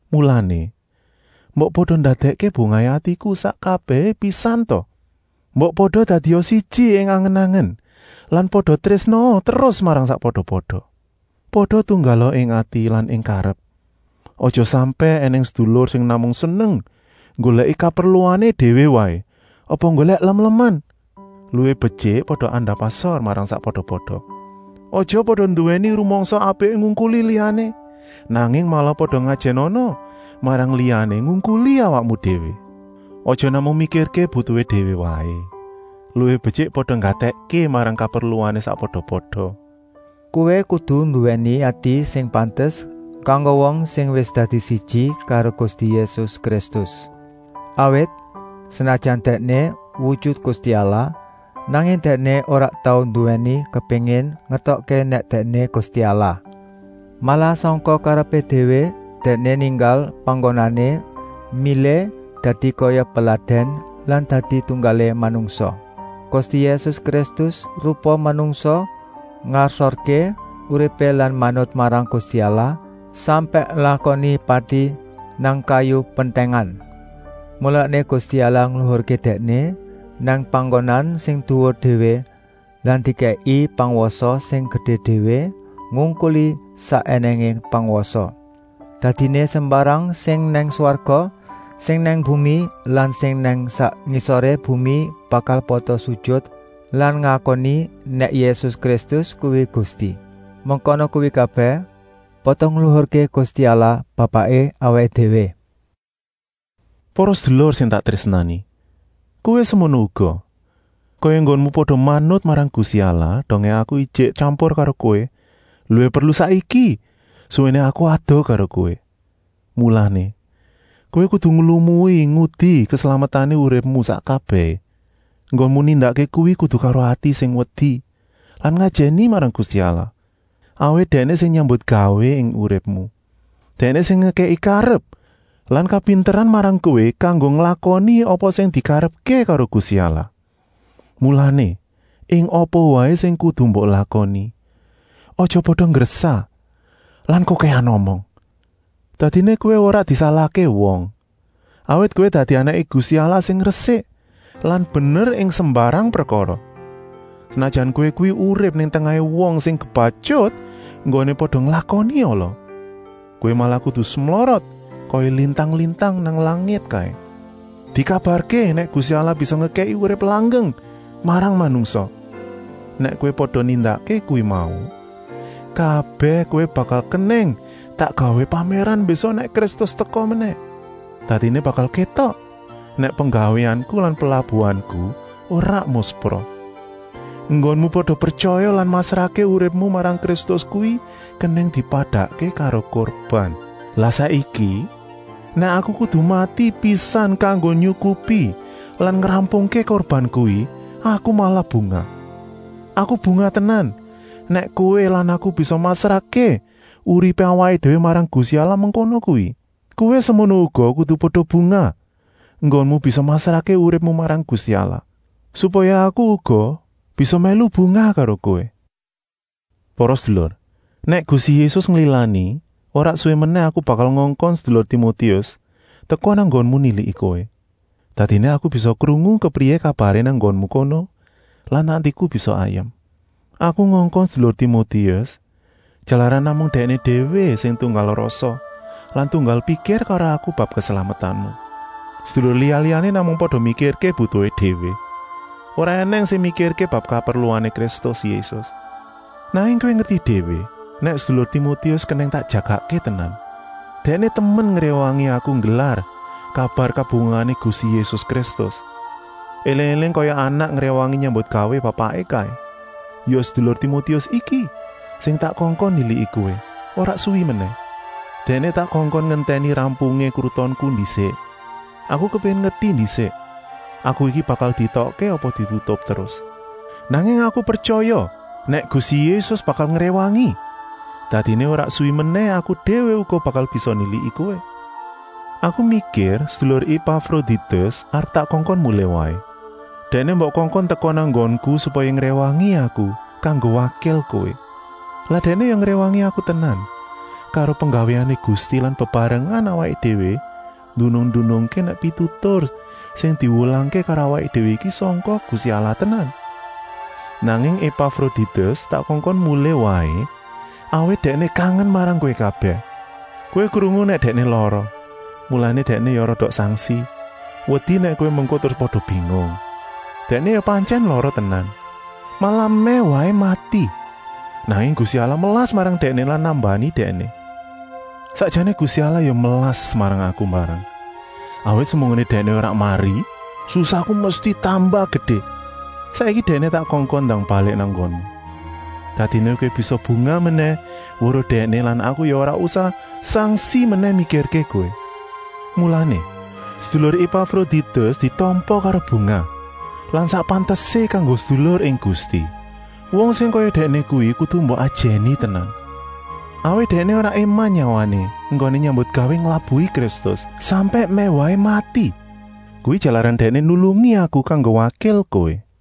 Mulané, mbok pada ndadèkké bungahé atiku sak kabèhé pisan ta! Mbok pada dadia siji ing angen-angen lan pada trésnaa terus marang sakpada-pada. Pada tunggala ing ati lan ing karep. Aja sampèk ènèng sedulur sing namung seneng nggolèki kaperluané déwé waé apa nggolèk lem-leman. Luwih betyik pada andap-asor marang sakpada-pada. Aja pada nduwèni rumangsa apiké ngungkuli liyané, nanging malah pada ngajènana marang liyané ngungkuli awakmu déwé. Aja namung mikirké butuhé déwé waé, luwih betyik pada nggatèkké marang kaperluané sakpada-pada. Kowé kudu nduwèni ati sing pantes kanggo wong sing wis dadi siji karo Gusti Yésus Kristus. Awit, senajan Dèkné wujut Gusti Allah, nanging Dèkné ora tau nduwèni kepéngin ngétokké nèk Dèkné Gusti Allah. Malah sangka karepé déwé Dèkné ninggal panggonané, milih dadi kaya peladèn lan dadi tunggalé manungsa. Gusti Yésus Kristus rupa manungsa ngasorké uripé lan manut marang Gusti Allah, sampèk nglakoni pati nang kayu pentèngan. Mulané Gusti Allah ngluhurké Dèkné nang panggonan sing duwur déwé lan dikèki pangwasa sing gedé déwé, ngungkuli sak ènèngé pangwasa. Dadiné sembarang sing nang swarga, sing nang bumi lan sing nang sak ngisoré bumi bakal pada sujut lan ngakoni nèk Yésus Kristus kuwi Gusti. Mengkono kuwi kabèh pada ngluhurké Gusti Allah Bapaké awaké déwé. Para sedulur sing tak trésnani! Kowé semono uga, kaya enggonmu pada manut marang Gusti Allah dongé aku ijik tyampur karo kowé, luwih perlu saiki, suwéné aku adoh karo kowé. Mulané, kowé kudu nglumui ngudi keslametané uripmu sak kabèhé. Enggonmu nindakké kuwi kudu karo ati sing wedi lan ngajèni marang Gusti Allah, awit Dèkné sing nyambutgawé ing uripmu. Dèkné sing ngekèki karep lan kapinteran marang kowé kanggo nglakoni apa sing dikarepké karo Gusti Allah. Mulané, ing apa waé sing kudu mbok lakoni, aja pada nggresah lan kokèhan omong. Dadiné kowé ora disalahké wong, awit kowé dadi anaké Gusti Allah sing resik lan bener ing sembarang prekara, senajan kowé kuwi urip nang tengahé wong sing kebatyut enggoné pada nglakoni ala. Kowé malah kudu semlorot kaya lintang-lintang nang langit kaé. Dikabarké nèk Gusti Allah bisa ngekèki urip langgeng marang manungsa. Nèk kowé pada nindakké kuwi mau kabèh kowé bakal kenèng tak gawé pamèran mbésuk nèk Kristus teka menèh. Dadiné bakal kétok nèk penggawéanku lan pelabuhanku ora muspra. Enggonmu pada pretyaya lan masrahké uripmu marang Kristus kuwi kenèng dipadakké karo kurban. Lah saiki, nèk aku kudu mati pisan kanggo nyukupi lan ngrampungké kurban kuwi, aku malah bungah. Aku bungah tenan nèk kowé lan aku bisa masrahké uripé awaké déwé marang Gusti Allah mengkono kuwi. Kowé semono uga kudu pada bungah enggonmu bisa masrahké uripmu marang Gusti Allah, supaya aku uga bisa mèlu bungah karo kowé. Para sedulur, nèk Gusti Yésus nglilani, ora suwi menèh aku bakal ngongkon sedulur Timotius teka nang nggonmu niliki kowé. Dadiné aku bisa krungu kepriyé kabaré nang nggonmu kono lan atiku bisa ayem. Aku ngongkon sedulur Timotius, jalaran namung dèkné déwé sing tunggal rasa lan tunggal pikir karo aku bab keslametanmu. Sedulur liya-liyané namung pada mikirké butuhé déwé, ora ènèng sing mikirké bab kaperluané Kristus Yésus. Nanging kowé ngerti déwé nèk sedulur Timotius kenèng tak jagakké tenan. Dèkné temen ngréwangi aku nggelar kabar kabungahané Gusti Yésus Kristus, éling-éling kaya anak ngréwangi nyambutgawé bapaké kaé. Ya sedulur Timotius iki sing tak kongkon niliki kowé, ora suwi menèh. Dèkné tak kongkon ngentèni rampungé krutonku ndisik. Aku kepéngin ngerti ndisik aku iki bakal dietokké apa ditutup terus. Nanging aku pretyaya nèk Gusti Yésus bakal ngréwangi, dadiné ora suwi menèh aku déwé uga bakal bisa niliki kowé. Aku mikir sedulur Epafroditus arep tak kongkon mulih waé. Dèkné mbok kongkon teka nang nggonku, supaya ngréwangi aku kanggo wakil kowé. Lan dèkné ya ngréwangi aku tenan karo penggawéané Gusti lan bebarengan awaké déwé ndunung-ndunungké nèk pitutur sing diwulangké karo awaké déwé iki sangka Gusti Allah tenan. Nanging Epafroditus tak kongkon mulih waé, awit dèkné kangen marang kowé kabèh. Kowé krungu nèk dèkné lara, mulané dèkné ya rada sangsi, wedi nèk kowé mengko terus pada bingung. Dèkné ya pantyèn lara tenan, malah mèh waé mati, nanging Gusti Allah melas marang dèkné lan nambani dèkné. Sakjané Gusti Allah ya melas marang aku mbarang, awit semunggoné dèkné ora mari, susahku mesti tambah gedé. Saiki dèkné tak kongkon ndang balik nang nggonmu, dadiné kowé bisa bungah menèh weruh dèkné lan aku ya ora usah sangsi menèh mikirké kowé. Mulané, sedulur Epafroditus ditampa karo bungah lan sak pantesé kanggo sedulur ing Gusti. Wong sing kaya dèkné kuwi kudu mbok ajèni tenan, awit dèkné ora éman nyawané enggoné nyambutgawé nglabuhi Kristus, sampèk mèh waé mati. Kuwi jalaran dèkné nulungi aku kanggo wakil kowé.